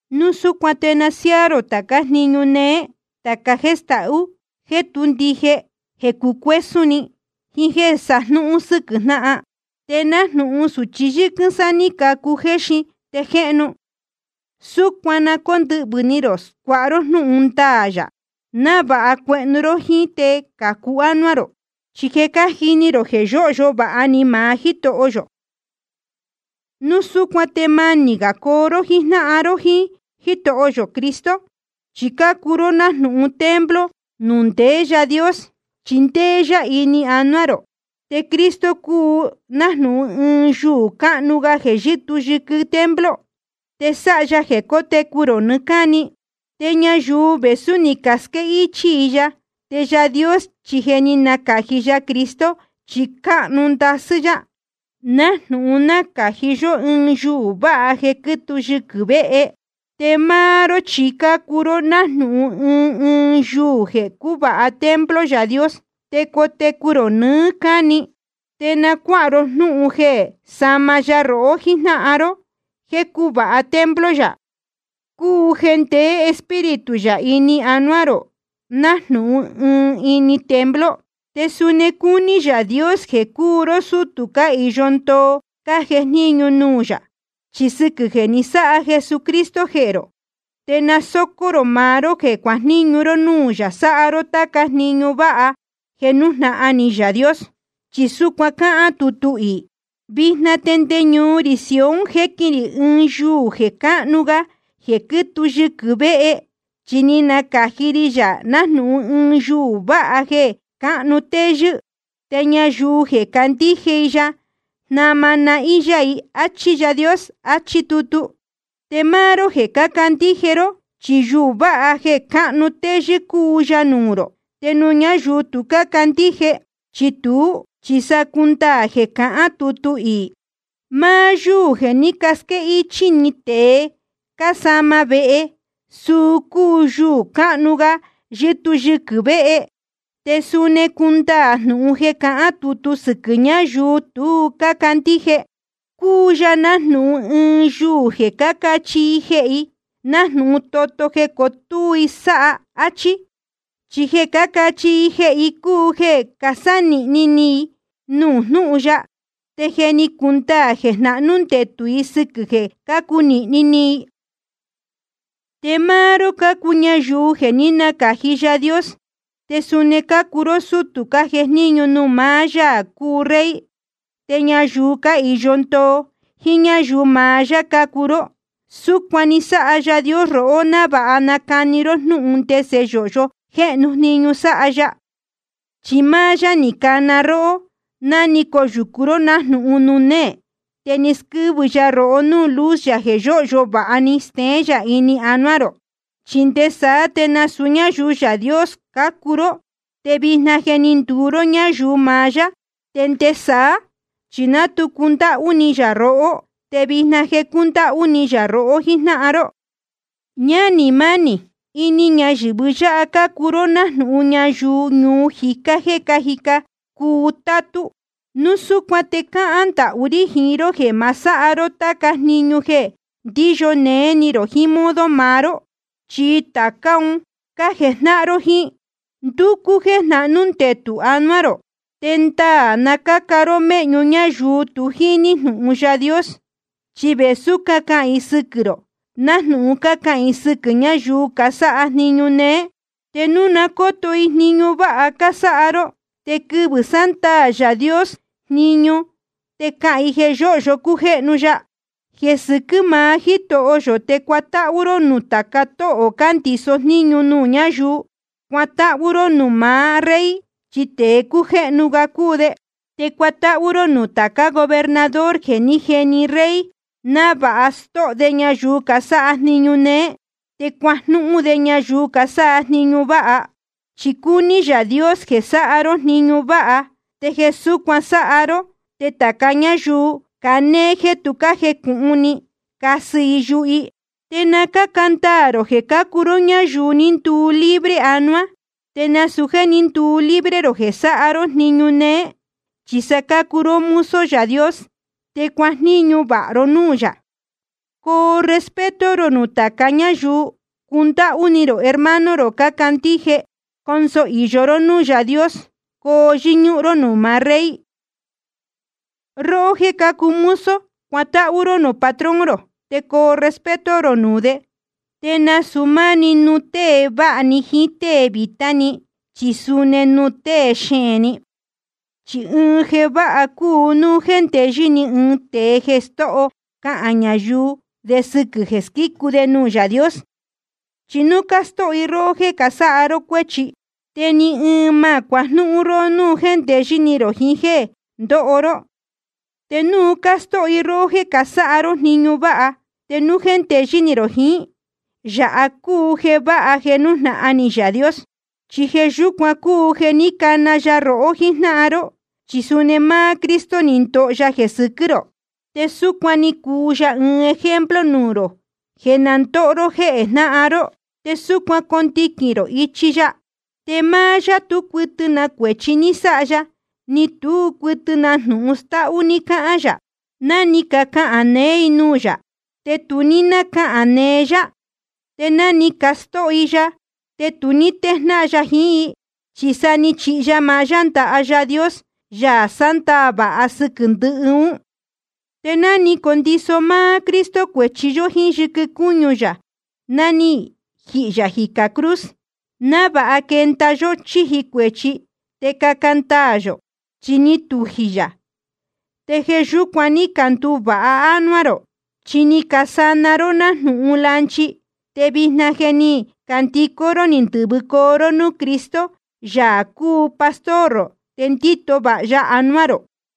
Núu súcuan te na siáá rō tācá jniñu néé, tāca jéē stahú, jéē tú ndije, jeē cucuésún ni, jiín jéē sajnúhún sɨ́quɨ̄ jnáhan. Te nájnūhun sūchi yɨ́quɨ́n sá ní cacu jeē jéxin te jéhnu, súcuan na cóndɨhvɨ̄ ni rō scuáha ró jnúhun ndaā yā, návāha cuehnu ró jíín te cācu ánuá rō. Chi je cájini rō jeē yóhyo vāha ni maá Jítoho yō. Núu súcuan te manī gā coo ró jíjnáhan ró jíín Jítoho yō Cristo. Chi cácuu ró nájnūhun templo nuū ndeé Yaā Dios, chi ndéé yá ini anuá rō. Te Cristo cúu nájnūhun ɨɨn yuū cánuú gá jeē yɨ́tuu yɨquɨ̄ templo, te sáha ya jeē cótecu rō nɨɨ́ cáni. Te ñayuu vēsú ni casquéhichī i ya, te Yaā Dios chi je ni nacāji ya Cristo chi cánuú ndasɨ́ yá, nájnūhun nácāji yó ɨɨn yuū váha jeē quítuu yɨquɨ̄ vehe. Te máá ró chi cácuu ró nájnūhun ɨɨn ɨɨn yuū jeē cúvāha templo Yaā Dios, te cotecu rō nɨɨ́ cáni. Te na cuáha ró jnúhun jeē sama ya rohó jíjnáhan ró jéē cúvāha templo yā, cúu jeē ndeé Espíritu yā ini anuá rō nájnūhun ini ɨɨn templo. Te suni cúní Yaā Dios jeē cuu ró sútū cáhīyo ndoo cájejníñu nuū yā. Chi sɨquɨ̄ jeē ni sáha Jesucristo jehē rō, te na sócó rō maá ró jeē cuajníñu ró núū yā sáha ró táca jniñu váha jeē nújnahan ni Yaā Dios. Chi súcuan cáhán tutu iī: Vijna te nde ñuu rī Sion jéquin rī ɨɨn yuū jeē cánuú gá jeē quítuu yɨquɨ̄ vehe, chi ni nacāji ri yā nájnūhun ɨɨn yuū váha jeē cánuú téyɨ́. Te ñayuu jeē candíje i ya, jnama nahín yá i. Achí Yaā Dios, áchí tutu. Te máá ró jeē cácandíje ró, chi yuū váha jeē cánuú téyɨ́ cúu ya nuū rō. Te nuū ñáyuu tu cácandíje chi tuú, chi sa cúndaā jeē cahán tutu iī: Máá yúū jeē ní casquéhichī tēe cásama vehe, suu cúu yuū cánuú gá yɨ́tuu yɨquɨ̄ vehe. Te suni cúndaā jnūhun jeē cahán tutu sɨquɨ̄ ñayuu tu cácandíje: Cúu ya nájnūhun ɨɨn yuū jeē cácachihi i jehē i, nájnūhun toto jeē cotúú i sáha. Achí. Chi jeē cácachihi i jehē i cúu jeē casánīhni ni i nuū jnúhun ya. Te je ni cundaā jeē jnahnú ndetū i sɨquɨ̄ jeē cácunīhni ni i. Te máá ró cácuu ñayuu jeē ní nacāji Yaā Dios. Te suni cácuu ró sútū cájejníñu nuū maá Yaā cúu Rey, te ñayuu cáhīyo ndoo, jíín ñáyuu maá yá cácuu ró. Súcuan ni sáha Yaā Dios rohó návāha nacani ró jnúhun ndese yōhyo jéhnu jniñu sáha ya, chi máá yá ni cana róhó ná ni coyūcu ró nájnūhun nuū néē. Te ni squɨ́vɨcoo ya rohó núū luz yā jeē yóhyo vāha stéén yā ini anuá rō. Chi nde saá te nasūu ñáyuu Yaā Dios cácuu ró, te vijna je ni nduu ró ñáyuu maá yá. Te nde saá chi ná tu cundáhú ni yā rohó, te vijna je cúndáhú ni yā rohó jíjnáhan ró. Ñánī mánī, ini ñayɨ̄vɨ yáha cácuu ró nájnūhun ñayuu ñuu jicá jéē cájica cuu tátú. Núu súcuan te cáhán ndahú rí jiín ró jéē ma sáha ró táca jniñu jeē ndíyo néé ni rō jiín modo maá ró. Chi tācá un cájejnáhan jíín ró, ndúcú jéē jnahnū ndetū anuá rō. Te ndaā na cáca ró méhñu ñáyuu tu jíní jnūhun Yaā Dios. Chi vēsú cácahān i sɨquɨ̄ rō, nájnūhun cácahān i sɨquɨ̄ ñáyuu casáha jniñu néé, te núu na cóto i jniñu váha cásáha ró, te quɨvɨ̄ sándaā Yaā Dios jniñu te cahān i jeē yóhyo cújéhnu ya. Jeē sɨquɨ́ maá Jítoho yō te cuatáhú ró nuū tāca tóhō cándiso jníñu nuū ñáyuu. Cuatáhú ró nuū maá rey, chi tēe cújéhnu ga cúu de. Te cuatáhú ró nuū tācá gobernador jeē ní jeni rey návāha stóho de ñayuu casáha jniñu néé te cuajnúhún de ñayuu casáha jniñu váha. Chi cúní Yaā Dios jeē sáha ró jniñu váha, te jeē súcuan sáha ró te tāca ñáyuu canéé jéē tu cájecūhun ni, casɨ i yuhu i. Te na cáca ndaā rō jeē cácuu ró ñáyuu ni nduu libre anuá, te nasūu jéē ní nduu libre rō jeē sáha ró jniñu néé. Chi sa cácuu ró mozo Yaā Dios, te cuajníñu vāha ró núū yā. Coo respeto rō nuū tāca ñáyuu. Cundáhú ni rō hermano cácandíje. Conso īyo ró núū Yaā Dios. Coo yɨ́ñúhún ró nuū maá rey. Róhó jéē cácuu mozo, cuatáhú ró nuū patrón rō, te coo respeto rō nuū de. Te nasūu máá‑ni nuū tée vāha ni jiín tée vītá ni, chi suni nuū tée xeēn ni. Chi ɨɨn jeē váha cúu núu jéndeyɨ́ ni ɨɨn tēe jeē stóho cāha ñáyuu de sɨquɨ̄ jeē squícu de nuū Yaā Dios. Chi núu cástóho i róhó jéē casáha ró cuéchi, te ni ɨɨn ma cuajnúhún róhó núu jéndeyɨ́ ni rō jiín jeē ndóho ró. Te núu cástóho i róhó jéē casáha ró jniñu váha, te núu jéndeyɨ́ ni rō jiín, yāha cúu jeē váha jeē nújnahan ni Yaā Dios. Chi jeē yúcuan cúu jeē ní cana ya rohó jíjnáhan ró. Chi suni máá Cristo ni ndoho ya jeē sɨquɨ́ rō, te súcuan ni cuu ya ɨɨn ejemplo nuū rō jeē na ndóho ró jéhē jnáhan ró, te súcuan condiquīn rō ichi ya. Te máá yá tú cuɨtɨ na cuēchi ní sáha ya, ni tú cuɨtɨ na jnūhun stáhú ní cáhán yā. Ná ni cacahān neé i nuū yā, te tu ní nácahān neé yá. Te ná ni castóho i ya, te tu ní téjnáhan ya jiín i, chi sa ni chihi ya maá yá ndaha Yaā Dios, Yaā sándaā vāha sɨquɨ̄ ndɨhɨ ún. Te ni condiso máá Cristo cuēchi yó jíín yɨquɨ cúñu yā ná ni jihī yā jicā cruz, návāha quenda yó chíji cuēchi te caca ndaā yō. Chi ni tujī yā, te jeē yúcuan ní canduvāha ánuá rō. Chi ni casana ró nájnūhun lanchi, te vijna je ni candicó ró ni ndɨ̄vɨcoo ró núū Cristo, Yaā cúu pastor rō te ndíto vāha ya anuá rō.